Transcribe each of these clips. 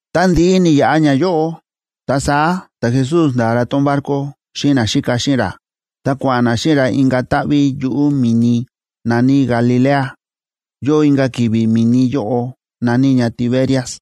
Ta ndi̱ꞌi ni̱yaꞌa ñayóꞌo, ta saá ta̱Jesús nda̱a ra tón barco xíꞌin naxíka xíꞌin ra, ta kua̱ꞌa̱n na xíꞌin ra inka̱ táꞌví yuꞌu̱ mi̱ni na̱ní Galilea. Yóo inka̱ ki̱vi̱ mi̱ni yóꞌo, na̱ní ña Tiberias.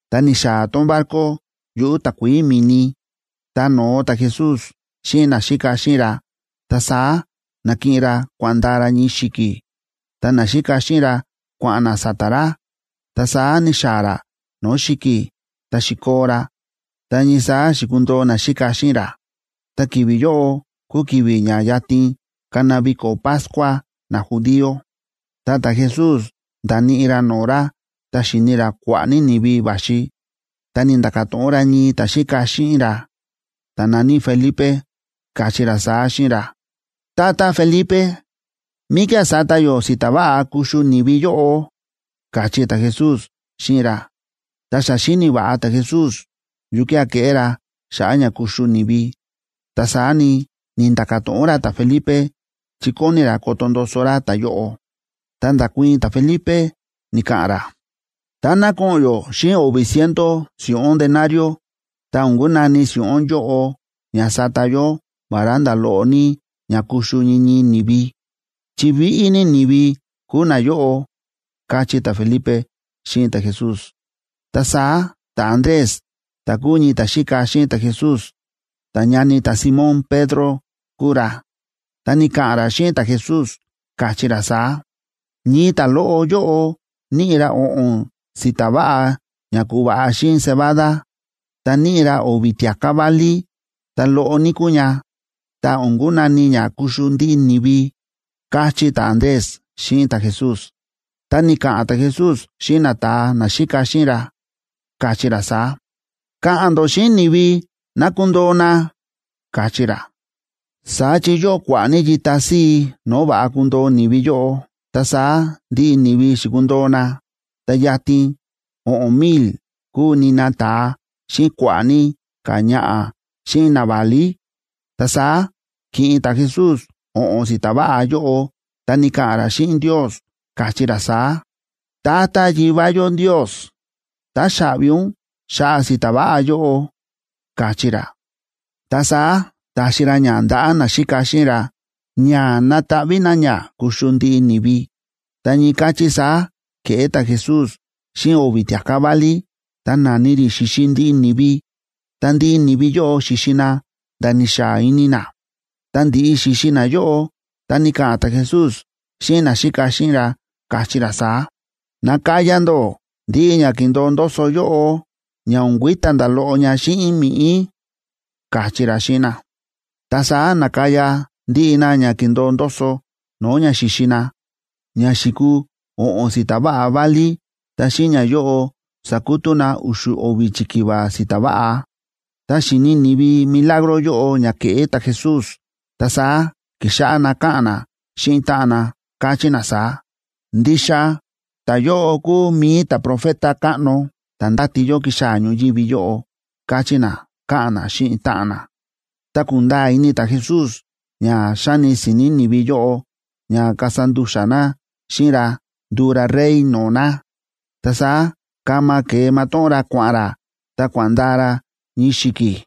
Ta ni̱xaa̱ tón barco yuꞌu̱ takuií mi̱ni, ta no̱o ta̱Jesús xíꞌin naxíka xíꞌin ra. Ta saá na̱kiꞌin ra kua̱ꞌa̱n ndaa ra ñii xi̱ki̱, ta naxíka xíꞌin ra kua̱ꞌa̱n na sa̱ta̱ ra. Ta saá ni̱xaa̱ ra no̱o̱ xi̱ki̱, ta xi̱koo ra ta ñii saá xi̱kundoo naxíka xíꞌin ra. Ta ki̱vi̱ yóꞌo kúu ki̱vi̱ ña yatin kana viko̱ Pascua najudío.a Ta ta̱Jesús nda̱níꞌi ra no̱o̱ ra, ta xi̱ni ra kua̱ꞌa̱ ní ni̱vi va̱xi, ta ni̱nda̱ka̱ to̱ꞌon ra ñii ta̱xíka xíꞌin ra, ta̱ na̱ní Felipe, káchí ra saá xíꞌin ra: ―Tata Felipe, ¿míkía̱ sata yó si̱ta̱ váꞌa kuxu ni̱vi yóꞌo? ―káchí ta̱Jesús xíꞌin ra. Ta xa xíni̱ va̱ꞌa ta̱Jesús yukía̱ keꞌé ra xa̱ꞌa̱ ña kuxu ni̱vi, ta saá ni, ni̱nda̱ka̱ to̱ꞌon ra ta̱Felipe chi kóni ra koto ndoso ra ta̱yóꞌo. Ta nda̱kuii̱n ta̱Felipe, ni̱ka̱ꞌa̱n ra: ―Táná ko̱ꞌo̱n yó xíꞌin o̱vi̱ ciento si̱ꞌún denario,b ta o̱n kunani si̱ꞌún yóꞌo ña sata yó vará nda̱ loꞌo ní ña kuxu ñii ñii ni̱vi, chi víꞌí ní ni̱vi kúu nayóꞌo ―káchí ta̱Felipe xíꞌin ta̱Jesús. Ta saá ta̱Andrés, ta̱ kúu ñii ta̱xíka xíꞌin ta̱Jesús, ta ñani ta̱Simón Pedro kúu ra, ta ni̱ka̱ꞌa̱n ra xíꞌin ta̱Jesús, káchí ra saá: ―Ñii ta̱loꞌo yóꞌo níꞌi ra o̱ꞌo̱n si̱ta̱ váꞌa ña ku̱va̱ꞌa xíꞌin cebada, ta níꞌi ra o̱vi̱ tia̱ká válí. Ta loꞌo ní kúu ña, ta o̱n kunani ña kuxu ndiꞌi ni̱vi ―káchí ta̱Andrés xíꞌin ta̱Jesús. Ta ni̱ka̱ꞌa̱n ta̱Jesús xíꞌin nata̱a naxíka xíꞌin ra, káchí ra saá: ―Ka̱ꞌa̱n ndó xíꞌin ni̱vi ná kundoo na ―káchí ra. Saá chi yóo kua̱ꞌa̱ ní yita síi no̱o̱ va̱ꞌa kundoo ni̱vi yóꞌo. Ta saá ndiꞌi ni̱vi xi̱kundoo na, ta yatin o̱ꞌo̱n mil kúu nina ta̱a, xíꞌin kua̱ꞌa̱ ní ka̱ ñaꞌa̱ xíꞌin naválí. Ta saá ki̱ꞌin ta̱Jesús o̱ꞌo̱n si̱ta̱ váꞌa yóꞌo, ta ni̱ka̱ꞌa̱n ra xíꞌin Ndios, káchí ra saá: ―Tata Yivá yó Ndios, táxaꞌvi ún xa̱ꞌa̱ si̱ta̱ váꞌa yóꞌo ―káchí ra. Ta saá ta̱xi ra ña ndaꞌa̱ naxíka xíꞌin ra, ña nataꞌví na ña kuxu ndiꞌi ni̱vi. Ta ñii káchí saá ke̱ꞌé ta̱Jesús xíꞌin o̱vi̱ tia̱ká válí, ta na̱ni rí xi̱xi ndiꞌi ni̱vi. Ta ndiꞌi ni̱vi yóꞌo xi̱xi na nda̱ ni̱xaa ini na. Tá ndi̱ꞌi xi̱xi nayóꞌo, ta ni̱ka̱ꞌa̱n ta̱Jesús xíꞌin naxíka xíꞌin ra, káchí ra saá: ―Nakaya ndó ndiꞌi ña kíndo̱o ndoso yóꞌo, ña o̱n kui̱ta̱ nda̱ loꞌo ña xíꞌin mi̱ꞌí ―káchí ra xíꞌin na. Ta saá na̱kaya ndiꞌi na ña ki̱ndo̱o ndoso no̱o̱ ña xi̱xi na, ña xi̱kuu o̱ꞌo̱n si̱ta̱ váꞌa válí. Ta xíꞌin ñayóꞌo sa̱kutú na u̱xu̱ o̱vi̱ chikiva si̱ta̱ váꞌa. Tá xi̱ni ni̱vi milagro yóꞌo ña ke̱ꞌé ta̱Jesús, ta saá ki̱xáꞌá na káꞌa̱n na xíꞌin táꞌan na, káchí na saá: ―Ndixa ta̱yóꞌo kúu mi̱i ta̱profeta káꞌno ta̱ ndáti yó kixaa̱ ñoyívi yóꞌo ―káchí na, káꞌa̱n na xíꞌin táꞌan na. Ta kúnda̱a̱ ini ta̱Jesús ña xáni si̱ni̱ ni̱vi yóꞌo ña kasa ndu̱xa̱ na xíꞌin ra nduu ra rey no̱o̱ na, ta saá kama ke̱e matóꞌón ra kua̱ꞌa̱n ra, ta kua̱ꞌa̱n ndaa ra ñii xi̱ki̱.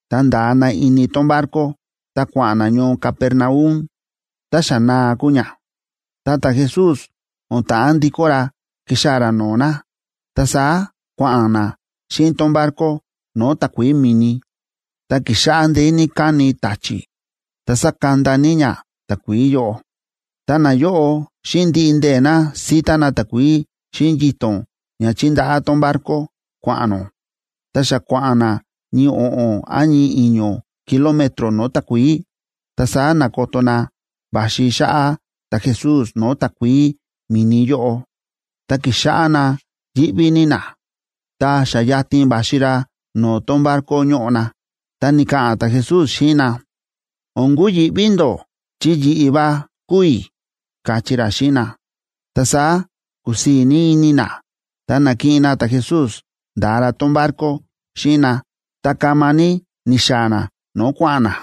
ta nda̱a na ini tón barco, ta kua̱ꞌa̱n na ñoo Capernaum. Ta xa naa kúu ña, ta ta̱Jesús o̱n ta̱ꞌán ndikó ra ki̱xaa̱ ra no̱o̱ na. Ta saá kua̱ꞌa̱n na xíꞌin tón barco no̱o̱ takuií mi̱ni, ta ki̱xáꞌá ndeé ní káni ta̱chi̱ ta sákanda ní ña takuií yóꞌo. Ta nayóꞌo, xíꞌin ndiꞌi ndee̱ na síta na takuií xíꞌin yito̱n ña chíndaꞌá tón barco kua̱ꞌa̱n nó, ta xa kua̱ꞌa̱n na ñii o̱ꞌo̱n án ñii i̱ño̱ kilómetro no̱o̱ takuií,c ta saá na̱koto na va̱xi xáꞌá ta̱Jesús no̱o̱ takuií mi̱ni yóꞌo, ta ki̱xáꞌá na yíꞌví ní na. Ta xa yatin va̱xi ra no̱o̱ tón barco ñóꞌo na, ta ni̱ka̱ꞌa̱n ta̱Jesús xíꞌin na: ―O̱n kuyi̱ꞌví ndó, chi yi̱ꞌi̱ va kúu i̱ ―káchí ra xíꞌin na. Ta saá kúsii̱ ní ini na, ta na̱kiꞌin na ta̱Jesús nda̱a ra tón barco xíꞌin na, ta kama ní ni̱xaa̱ na no̱o̱ kua̱ꞌa̱n na.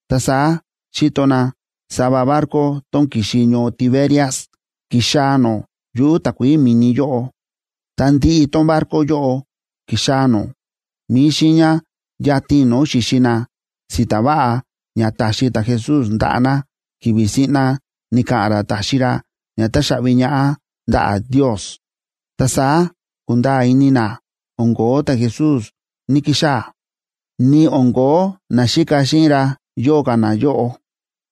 Ta saá xi̱to na sava barco tón ki̱xi ñoo Tiberias ki̱xaa̱ nó yuꞌu̱ takuií mi̱ni yóꞌo. Ta ndiꞌi tón barco yóꞌo ki̱xaa̱ nó mi̱i xiiña yatin no̱o̱ xi̱xi na si̱ta̱ váꞌa ña ta̱xi ta̱Jesús ndaꞌa̱ na, ki̱vi̱ siꞌna ni̱ka̱ꞌa̱n ra ta̱xi ra ña táxaꞌvi ñaꞌá ndaꞌa̱ Ndios. Ta saá ku̱nda̱a̱ ini na o̱n ko̱ó ta̱Jesús ní‑kixaa̱, ni o̱n ko̱ó naxíka xíꞌin ra yóo ka̱ na yóꞌo,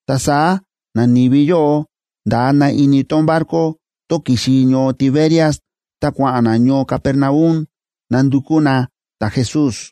ta saá nani̱vi yóꞌo nda̱a na ini tón barco tón ki̱xi ñoo Tiberias, ta kua̱ꞌa̱n na ñoo Capernaum nandukú na ta̱Jesús.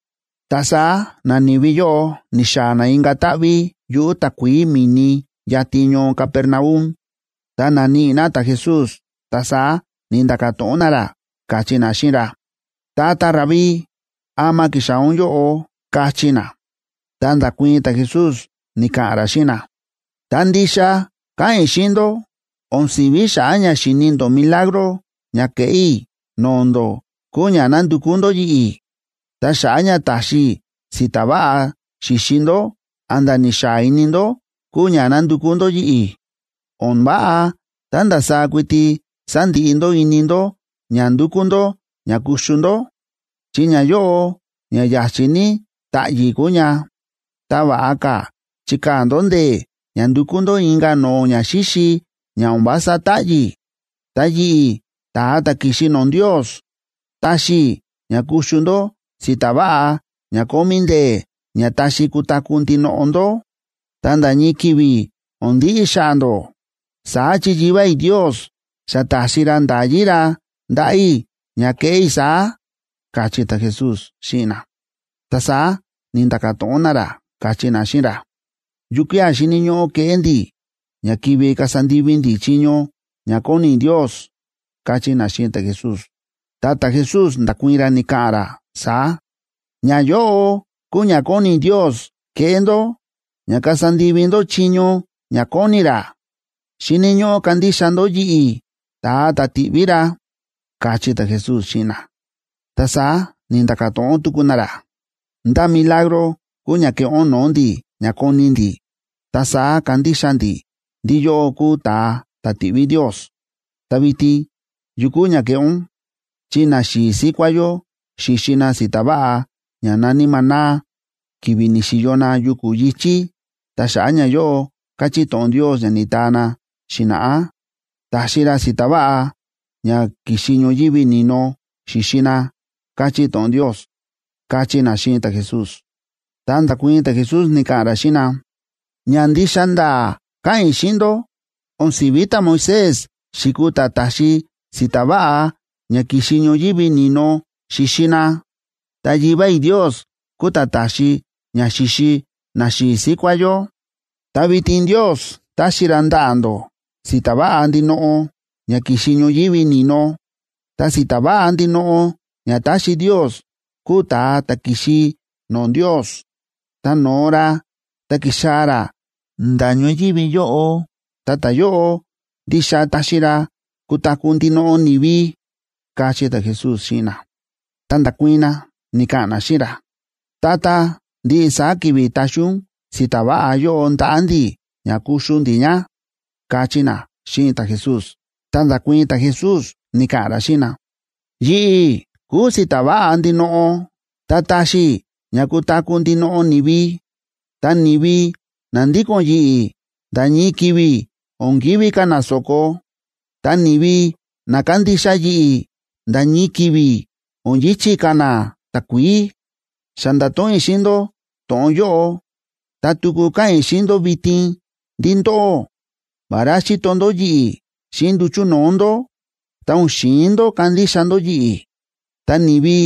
Ta saá nani̱vi yóꞌo ni̱xaa̱ na inka̱ táꞌví yuꞌu̱ takuií mi̱ni yatin ñoo Capernaum, ta na̱níꞌi na ta̱Jesús. Ta saá ni̱nda̱ka̱ to̱ꞌon na ra, káchí na xíꞌin ra: ―Tata Rabí, ¿ama ki̱xaa̱ ún yóꞌo? ―káchí na. Ta nda̱kuii̱n ta̱Jesús, ni̱ka̱ꞌa̱n ra xíꞌin na: ―Ta ndixa káꞌa̱n i̱ xíꞌin ndó o̱n si̱ví xa̱ꞌa̱ ña xi̱ni ndó milagro ña ke̱ꞌé i̱ no̱o̱ ndó kúu ña nándukú ndó yi̱ꞌi̱. Ta xa̱ꞌa̱ ña ta̱xi i̱ si̱ta̱ váꞌa xi̱xi ndó a̱nda̱ ni̱xaa ini ndó kúu ña nándukú ndó yi̱ꞌi̱. O̱n váꞌa tá ndasaá kuiti sandiꞌi ndó ini ndó ña ndúkú ndó ña kuxu ndó, chi ñayóꞌo ña ya̱chi̱ ní táꞌyi̱ kúu ña. Ta va̱ꞌa ka̱ chikaa̱ ndó ndee̱ ña ndukú ndó inka̱ no̱o̱ ñaxíxi ña o̱n vása táꞌyi̱. Ta yi̱ꞌi̱, ta̱a ta̱ ki̱xi no̱o̱ Ndios, taxi i̱ ña kuxu ndó si̱ta̱ váꞌa ña kómí ndee̱ ña taxi kutaku̱ ndinoꞌo ndó, ta nda̱ ñii ki̱vi̱ o̱n ndiꞌi xa̱ꞌa̱ ndó. Saá chi Yivá i̱ Ndios xa ta̱xi ra nda̱yí ra ndaꞌa̱ i̱ ña keꞌé i̱ saá ―káchí ta̱Jesús xíꞌin na. Ta saá ni̱nda̱ka̱ to̱ꞌon na ra, káchí na xíꞌin ra: ―¿Yukía̱ xíni̱ ñóꞌó keꞌé ndi̱ ña kivi kasa ndivi ndi̱ chiño ña kóni Ndios? ―káchí na xíꞌin ta̱Jesús. Ta ta̱Jesús nda̱kuii̱n ra, ni̱ka̱ꞌa̱n ra saá: ―Ñayóꞌo kúu ña kóni Ndios keꞌé ndó ña kasa ndivi ndó chiño ña kóni ra: xíni̱ ñóꞌó kandixa ndó yi̱ꞌi̱, ta̱a ta̱ ti̱ꞌví ra ―káchí ta̱Jesús xíꞌin na. Ta saá ni̱nda̱ka̱ to̱ꞌon tuku na ra: ―¿Ndá milagro kúu ña keꞌé ún no̱o̱ ndi̱ ña koni ndi̱, ta saá kandixa ndi̱ ndí yóꞌó kúu ún ta̱a ta̱ ti̱ꞌví Ndios? Ta vitin, ¿yu kúu ña keꞌé ún? Chi naxi̱i̱ síkuá yó xi̱xi na si̱ta̱ váꞌa ña na̱ní maná ki̱vi̱ ni̱xi̱yo na yuku̱ yi̱chí. Ta xa̱ꞌa̱ ñayóꞌo káchí to̱ꞌon Ndios ña ni̱taa na xi̱na̱ꞌá: “Ta̱xi ra si̱ta̱ váꞌa ña ki̱xi ñoyívi ni̱no, xi̱xi na”, káchí to̱ꞌon Ndios ―káchí na xíꞌin ta̱Jesús. Ta nda̱kuii̱n ta̱Jesús ni̱ka̱ꞌa̱n ra xíꞌin na: ―Ña ndixa nda̱a̱ káꞌa̱n i̱ xíꞌin ndó, o̱n si̱ví ta̱Moisés xi̱kuu ta̱ ta̱xi si̱ta̱ váꞌa ña ki̱xi ñoyívi ni̱no xi̱xi na, ta Yivá i̱ Ndios kúu ta̱ ta̱xi ña xi̱xi naxi̱i̱ síkuá yó. Ta vitin Ndios táxi ra ndaꞌa̱ ndó si̱ta̱ váꞌa ndinoꞌo ña ki̱xi ñoyívi ni̱no. Ta si̱ta̱ váꞌa ndinoꞌo ña táxi Ndios kúu ta̱a ta̱ ki̱xi no̱o̱ Ndios ta no̱o ra ta ki̱xaa̱ ra nda̱ ñoyívi yóꞌo, ta ta̱yóꞌo ndixa taxi ra kutaku̱ ndinoꞌo ni̱vi ―káchí ta̱Jesús xíꞌin na. Ta nda̱kuii̱n na, ni̱ka̱ꞌa̱n na xíꞌin ra: ―Tata, ndiꞌi saá ki̱vi̱ taxi ún si̱ta̱ váꞌa yóꞌo ndaꞌa̱ ndi̱ ña kuxu ndi̱ ña ―káchí na xíꞌin ta̱Jesús. Ta nda̱kuii̱n ta̱Jesús ni̱ka̱ꞌa̱n ra xíꞌin na: ―Yi̱ꞌi̱ kúu si̱ta̱ váꞌa ndinoꞌo, ta táxi i̱ ña kutaku̱ ndinoꞌo ni̱vi. Ta ni̱vi na ndíko̱n yi̱ꞌi̱ nda̱ ñii ki̱vi̱ o̱n kivi̱ ka̱ na so̱ko, ta ni̱vi na kándixa yi̱ꞌi̱ nda̱ ñii ki̱vi̱ o̱n yi̱chi̱ ka̱ na takuií. Xa nda̱to̱ꞌon i̱ xíꞌin ndó to̱ꞌon yóꞌo, ta tuku káꞌa̱n i̱ xíꞌin ndó vitin ndí ndóꞌó, vará xíto ndó yi̱ꞌi̱ xíꞌin nduchu̱ no̱o̱ ndó, ta o̱n xi̱in ndó kandixa ndó yi̱ꞌi̱. Ta ni̱vi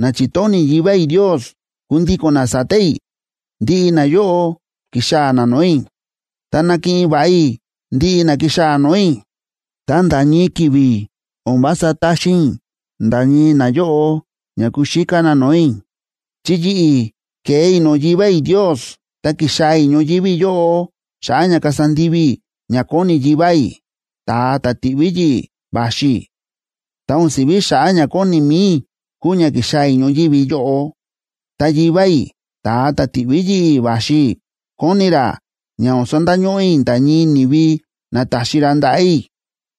na chi̱tóni̱ Yivá i̱ Ndios kundíko̱n na sa̱ta̱ i̱, ndiꞌi nayóꞌo kixaa̱ na no̱o̱ i̱. Ta nakiꞌin va̱ꞌa i̱ ndiꞌi na kixaa̱ no̱o̱ i̱, ta nda̱ ñii ki̱vi̱ o̱n vása taxin i̱ nda̱ ñii nayóꞌo ña kuxíká na no̱o̱ i̱. Chi yi̱ꞌi̱ ke̱e i̱ no̱o̱ Yivá i̱ Ndios ta ki̱xaa̱ i̱ ñoyívi yóꞌo xa̱ꞌa̱ ña kasa ndivi i̱ ña kóni Yivá i̱, ta̱a ta̱ ti̱ꞌví yi̱ꞌi̱ va̱xi i̱. Ta o̱n si̱ví xa̱ꞌa̱ ña kóni mi̱i i̱ kúu ña ki̱xaa̱ i̱ ñoyívi yóꞌo. Ta Yivá i̱, ta̱a ta̱ ti̱ꞌví yi̱ꞌi̱ va̱xi i̱, kóni ra ña o̱n sandañóꞌó i̱ nda̱ ñii ni̱vi na ta̱xi ra ndaꞌa̱ i̱.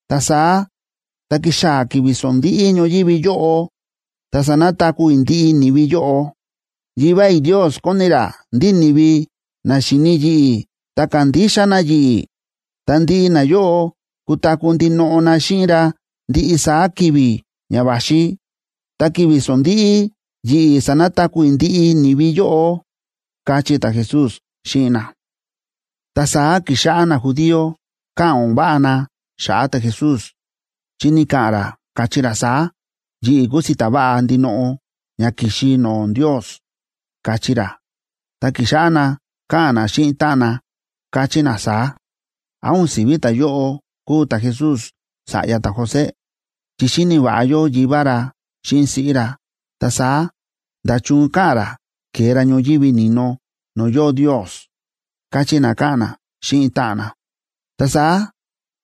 Ta saá tá kixaa̱ ki̱vi̱ sondíꞌí ñoyívi yóꞌo, ta sanataku̱ i̱ ndiꞌi ni̱vi yóꞌo. Yivá i̱ Ndios kóni ra ndí ni̱vi na xíni yi̱ꞌi̱ ta kándixa na yi̱ꞌi̱, ta ndiꞌi nayóꞌo kutaku̱ ndinoꞌo na xíꞌin ra ndiꞌi saá ki̱vi̱ ña va̱xi, ta ki̱vi̱ sondíꞌí, yi̱ꞌi̱ sanataku̱ i̱ ndiꞌi ni̱vi yóꞌo ―káchí ta̱Jesús xíꞌin na. Ta saá ki̱xáꞌá najudío káꞌa̱n o̱n váꞌa na xa̱ꞌa̱ ta̱Jesús, chi ni̱ka̱ꞌa̱n ra, káchí ra saá: “Yi̱ꞌi̱ kúu si̱ta̱ váꞌa ndinoꞌo ña ki̱xi no̱o̱ Ndios”, káchí ra. Ta ki̱xáꞌá na káꞌa̱n na xíꞌin táꞌan na, káchí na saá: ―¿Án o̱n si̱ví ta̱yóꞌo kúu ta̱Jesús sa̱ꞌya ta̱José?, chi xíni̱ va̱ꞌa yó yivá ra, xíꞌin siꞌí ra. Ta saá, ¿nda̱chun káꞌa̱n ra ke̱e ra ñoyívi ni̱no no̱o̱ yóo Ndios? ―káchí na, káꞌa̱n na xíꞌin táꞌan na. Ta saá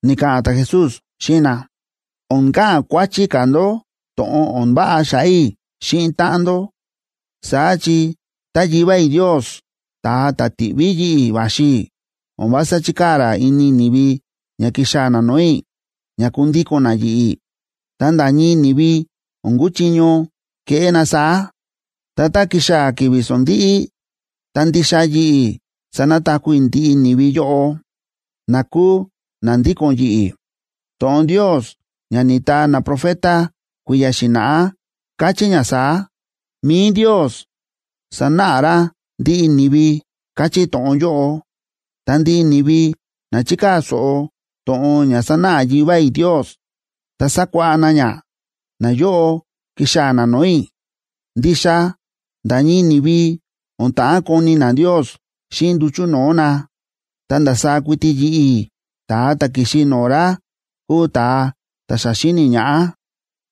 ni̱ka̱ꞌa̱n ta̱Jesús xíꞌin na: ―O̱n ka̱ꞌa̱n kuáchí ka̱ ndó to̱ꞌon o̱n váꞌa xa̱ꞌa̱ i̱ xíꞌin táꞌan ndó. Saá chi tá Yivá i̱ Ndios, ta̱a ta̱ ti̱ꞌví yi̱ꞌi̱ va̱xi i̱, o̱n vása chíkaa̱ ra ini ni̱vi ña kixaa̱ na no̱o̱ i̱ ña kundíko̱n na yi̱ꞌi̱, ta nda̱ ñii ni̱vi o̱n kuchiño keꞌé na saá. Ta tá kixaa̱ ki̱vi̱ sondíꞌí, ta ndixa yi̱ꞌi̱ sanataku̱ i̱ ndiꞌi ni̱vi yóꞌo, na kúu na ndíko̱n yi̱ꞌi̱. To̱ꞌon Ndios ña ni̱taa naprofeta kui̱ya̱ xi̱na̱ꞌá káchí ña saá: “Mi̱i Ndios sanáꞌa ra ndiꞌi ni̱vi”, káchí to̱ꞌon yóꞌo. Ta ndiꞌi ni̱vi na chikaa̱ so̱ꞌo to̱ꞌon ña sánáꞌa Yivá i̱ Ndios ta sakuáꞌá na ña, nayóꞌo kixaa̱ na no̱o̱ i̱. ’Ndixa nda̱ ñii ni̱vi o̱n ta̱ꞌán koni na Ndios xíꞌin nduchu̱ no̱o̱ na, ta ndasaá kuiti yi̱ꞌi̱, ta̱a ta̱ ki̱xi no̱o̱ ra kúu ta̱a ta̱ xa xi̱ni ñaꞌá.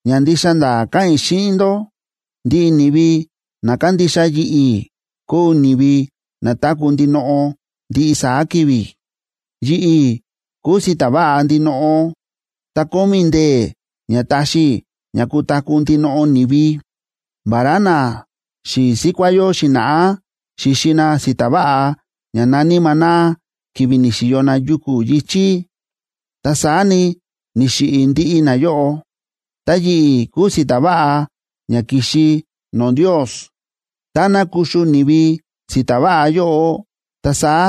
Ña ndixa nda̱a̱ káꞌa̱n i̱ xíꞌin ndó: Ndiꞌi ni̱vi na kándixa yi̱ꞌi̱ kúu ni̱vi na táku̱ ndinoꞌo ndiꞌi saá ki̱vi̱. Yi̱ꞌi̱ kúu si̱ta̱ váꞌa ndinoꞌo, ta kómí i̱ ndee̱ ña taxi i̱ ña kutaku̱ ndinoꞌo ni̱vi. Vará naxi̱i̱ síkuá yó xi̱na̱ꞌá xi̱xi na si̱ta̱ váꞌa ña na̱ní maná ki̱vi̱ ni̱xi̱yo na yuku̱ yi̱chí, ta saá ni, ni̱xiꞌi̱ ndiꞌi nayóꞌo. Ta yi̱ꞌi̱ kúu si̱ta̱ váꞌa ña ki̱xi no̱o̱ Ndios. Táná kuxu ni̱vi si̱ta̱ váꞌa yóꞌo, ta saá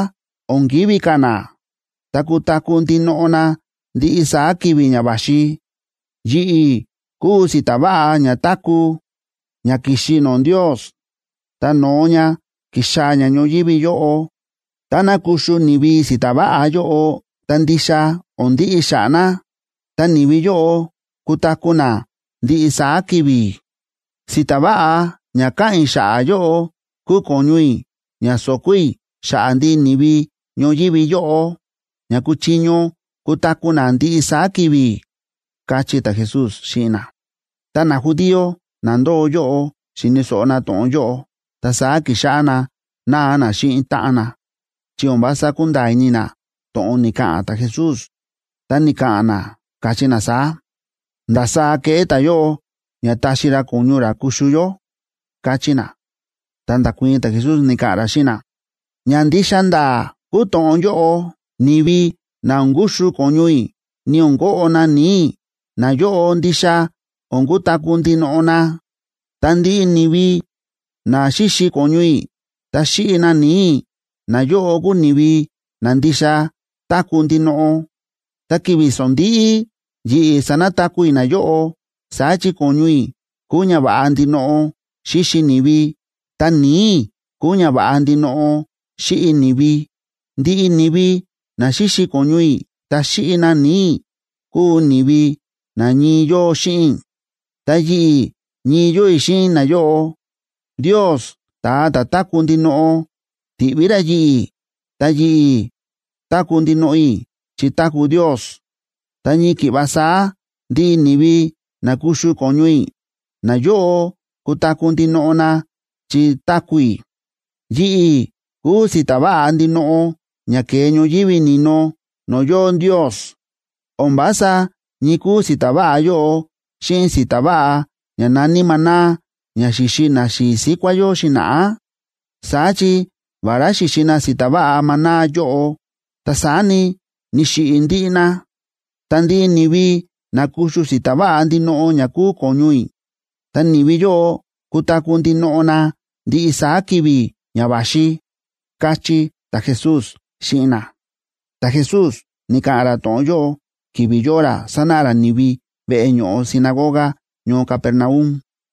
o̱n kivi̱ ka̱ na, ta kutaku̱ ndinoꞌo na ndiꞌi saá ki̱vi̱ ña va̱xi. Yi̱ꞌi̱ kúu si̱ta̱ váꞌa ña táku̱, ña ki̱xi no̱o̱ Ndios, ta no̱o ña ki̱xaa̱ ña ñoyívi yóꞌo. Táná kuxu ni̱vi si̱ta̱ váꞌa yóꞌo, ta ndixa o̱n ndiꞌi xa̱ꞌa̱ na, ta ni̱vi yóꞌo kutaku̱ na ndiꞌi saá ki̱vi̱. Si̱ta̱ váꞌa ña káꞌa̱n i̱ xa̱ꞌa̱ yóꞌo kúu ko̱ñu i̱ ña so̱ko̱ i̱ xa̱ꞌa̱ ndiꞌi ni̱vi ñoyívi yóꞌo ña kuchiño kutaku̱ na ndiꞌi saá ki̱vi̱ ―káchí ta̱Jesús xíꞌin na. Tá najudío na ndóo yóꞌo xi̱ni̱ so̱ꞌo na to̱ꞌon yóꞌo, ta saá ki̱xáꞌá na náa na xíꞌin táꞌan na, chi o̱n vása kúnda̱a̱ ini na to̱ꞌon ni̱ka̱ꞌa̱n ta̱Jesús. Ta ni̱ka̱ꞌa̱n na, káchí na saá: ―¿Ndasaá keꞌé ta̱yóꞌo ña taxi ra ko̱ñu ra kuxu yó? ―káchí na. Ta nda̱kuii̱n ta̱Jesús, ni̱ka̱ꞌa̱n ra xíꞌin na: ―Ña ndixa nda̱a̱ kúu to̱ꞌon yóꞌo: Ni̱vi na o̱n kuxu ko̱ñu i̱ ni o̱n koꞌo na ni̱i̱ i̱, nayóꞌo ndixa o̱n kutaku̱ ndinoꞌo na. Ta ndiꞌi ni̱vi na xíxi ko̱ñu i̱ ta xíꞌi na ni̱i̱ i̱, nayóꞌo kúu ni̱vi na ndixa táku̱ ndinoꞌo, ta ki̱vi̱ sondíꞌí, yi̱ꞌi̱ sanataku̱ i̱ nayóꞌo. Saá chi ko̱ñu i̱ kúu ñava̱ꞌa ndinoꞌo xíxi ni̱vi, ta ni̱i̱ i̱ kúu ñava̱ꞌa ndinoꞌo xíꞌi ni̱vi. Ndiꞌi ni̱vi na xíxi ko̱ñu i̱ ta xíꞌi na ni̱i̱ i̱ kúu ni̱vi na ñii yóo xíꞌin i̱, ta yi̱ꞌi̱ ñii yóo i̱ xíꞌin nayóꞌo. Ndios ta̱a ta̱ táku̱ ndinoꞌo, ti̱ꞌví ra yi̱ꞌi̱, ta yi̱ꞌi̱ táku̱ ndinoꞌo i̱ chi táku̱ Ndios. Ta ñii ki̱ꞌva saá ndiꞌi ni̱vi na kuxu ko̱ñu i̱, nayóꞌo kutaku̱ ndinoꞌo na chi táku̱ i̱. Yi̱ꞌi̱ kúu si̱ta̱ váꞌa ndinoꞌo ña ke̱e ñoyívi ni̱no no̱o̱ yóo Ndios. O̱n vása ñii kúu si̱ta̱ váꞌa yóꞌo xíꞌin si̱ta̱ váꞌa ña na̱ní maná ña xi̱xi naxi̱i̱ síkuá yó xi̱na̱ꞌá. Saá chi, vará xi̱xi na si̱ta̱ váꞌa maná yóꞌo, ta saá ni, ni̱xiꞌi̱ ndiꞌi na. Ta ndiꞌi ni̱vi na kuxu si̱ta̱ váꞌa ndinoꞌo ña kúu ko̱ñu i̱, ta ni̱vi yóꞌo kutaku̱ ndinoꞌo na ndiꞌi saá ki̱vi̱ ña va̱xi ―káchí ta̱Jesús xíꞌin na. Ta̱Jesús ni̱ka̱ꞌa̱n ra to̱ꞌon yóꞌo ki̱vi̱ yóo ra sánáꞌa ra ni̱vi veꞌe ño̱ꞌo sinagoga ñoo Capernaum.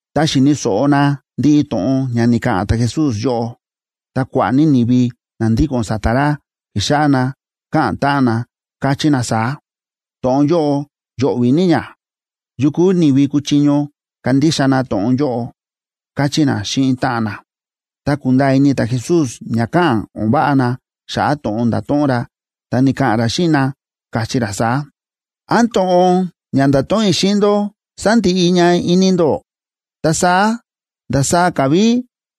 Tá xi̱ni̱ so̱ꞌo na ndiꞌi to̱ꞌon ña ni̱ka̱ꞌa̱n ta̱Jesús yóꞌo, ta kua̱ꞌa̱ ní ni̱vi na ndíko̱n sa̱ta̱ ra, ki̱xáꞌá na káꞌa̱n táꞌan na, káchí na saá: ―To̱ꞌon yóꞌo yo̱ꞌvi̱ ní ña. ¿Yu kúu ni̱vi kuchiño kandixa na to̱ꞌon yóꞌo? ―káchí na xíꞌin táꞌan na. Ta kúnda̱a̱ ini ta̱Jesús ña káꞌa̱n o̱n váꞌa na xa̱ꞌa̱ to̱ꞌon nda̱to̱ꞌon ra, ta ni̱ka̱ꞌa̱n ra xíꞌin na, káchí ra saá: ―¿Án to̱ꞌon ña nda̱to̱ꞌon i̱ xíꞌin ndó sándiꞌi ña ini ndó? Ta saá, ¿ndasaá ka̱ ví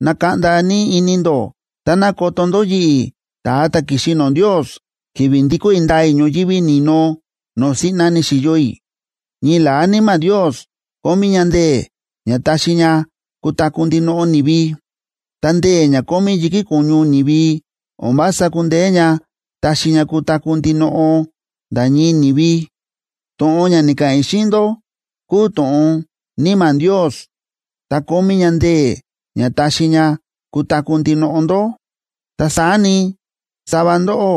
nakaꞌnda ní ini ndó táná koto ndó yi̱ꞌi̱, ta̱a ta̱ ki̱xi no̱o̱ Ndios, ki̱vi̱ ndikó i̱ ndaa i̱ ñoyívi ni̱no no̱o̱ siꞌna ni̱xi̱yo i̱? Ñii la̱á Níma̱ Ndios kómí ña ndee̱ ña taxi ña kutaku̱ ndinoꞌo ni̱vi, ta ndee̱ ña kómí yi̱kí ko̱ñu ni̱vi o̱n vása kúndeé ña taxi ña kutaku̱ ndinoꞌo nda̱ ñii ni̱vi. To̱ꞌon ña ni̱ka̱ꞌa̱n i̱ xíꞌin ndó kúu to̱ꞌon Níma̱ Ndios ta kómí ña ndee̱ ña taxi ña kutaku̱ ndinoꞌo ndó. Ta saá ni, sava ndóꞌó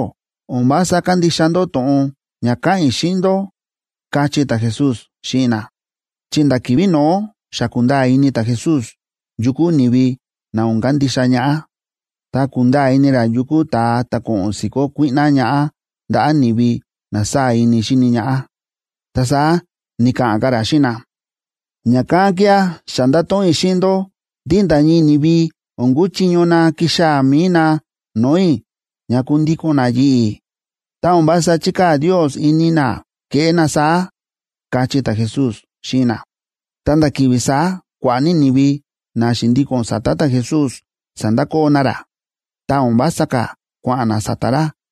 o̱n vása kándixa ndó to̱ꞌon ña káꞌa̱n i̱ xíꞌin ndó ―káchí ta̱Jesús xíꞌin na. Chi nda̱ ki̱vi̱ no̱ó xa kúnda̱a̱ ini ta̱Jesús yu kuu ni̱vi na o̱n kandixa ñaꞌá, ta kúnda̱a̱ ini ra yu kuu ta̱a ta̱ ko̱ꞌo̱n si̱kó kuíꞌná ñaꞌá ndaꞌa̱ ni̱vi na sáa̱ ini xíni ñaꞌá. Ta saá ni̱ka̱ꞌa̱n ka̱ ra xíꞌin na: ―Ña̱kán kía̱ xa nda̱to̱ꞌon i̱ xíꞌin ndó ndí nda̱ ñii ni̱vi o̱n kuchiño na kixaa̱ mi̱i na no̱o̱ i̱ ña kundíko̱n na yi̱ꞌi̱, tá o̱n vása chíkaa̱ Ndios ini na keꞌé na saá ―káchí ta̱Jesús xíꞌin na. Ta nda̱ ki̱vi̱ saá kua̱ꞌa̱ ní ni̱vi na xi̱ndíko̱n sa̱ta̱ ta̱Jesús, sa̱ndakoo na ra, ta o̱n vása ka̱ kua̱ꞌa̱n na sa̱ta̱ ra.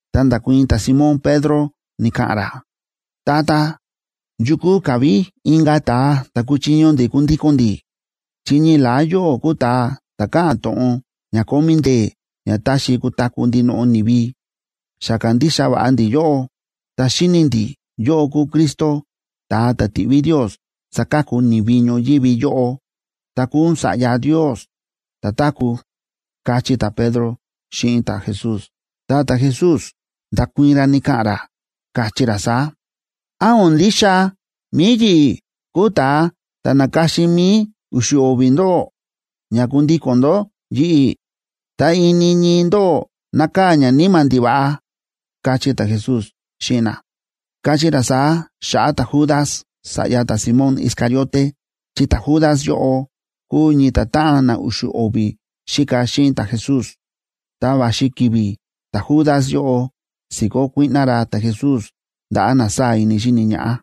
Ta nda̱kuii̱n ta̱Simón Pedro ni̱ka̱ꞌa̱n ra: ―Tata, ¿yu kúu ka̱ ví inka̱ ta̱a ta̱ kuchiño ndi̱ kundíko̱n ndi̱?, chi ñii la̱á yóꞌó kúu ta̱a ta̱ káꞌa̱n to̱ꞌon ña kómí ndee̱ ña taxi kutaku̱ ndinoꞌo ni̱vi. Xa kándixa va̱ꞌa ndi̱ yóꞌó, ta xíni̱ ndi̱ yóꞌó kúu Cristo, ta̱a ta̱ ti̱ꞌví Ndios saka̱ku ni̱vi ñoyívi yóꞌo ta kúu ún Sa̱ꞌya Ndios ta̱táku̱ ―káchí ta̱Pedro xíꞌin ta̱Jesús. Ta ta̱Jesús nda̱kuii̱n ra ni̱ka̱ꞌa̱n ra, káchí ra saá: ―¿Án o̱n ndixa mi̱i yi̱ꞌi̱ kúu ta̱a ta̱ na̱ka̱xin mi̱i u̱xu̱ o̱vi̱ ndóꞌó ña kundíko̱n ndó yi̱ꞌi̱?, ta ini ñii ndóꞌó nákaa̱ ñaníma̱ ndiva̱ꞌa ―káchí ta̱Jesús xíꞌin na. Káchí ra saá xa̱ꞌa̱ ta̱Judas sa̱ꞌya ta̱Simón Iscariote, chi ta̱Judas yóꞌo kúu ñii ta̱táꞌan na u̱xu̱ o̱vi̱ xíka xíꞌin ta̱Jesús, ta va̱xi ki̱vi̱ ta̱Judas yóꞌo si̱kó kuíꞌná ra ta̱Jesús ndaꞌa̱ na sáa̱ ini xíni ñaꞌá.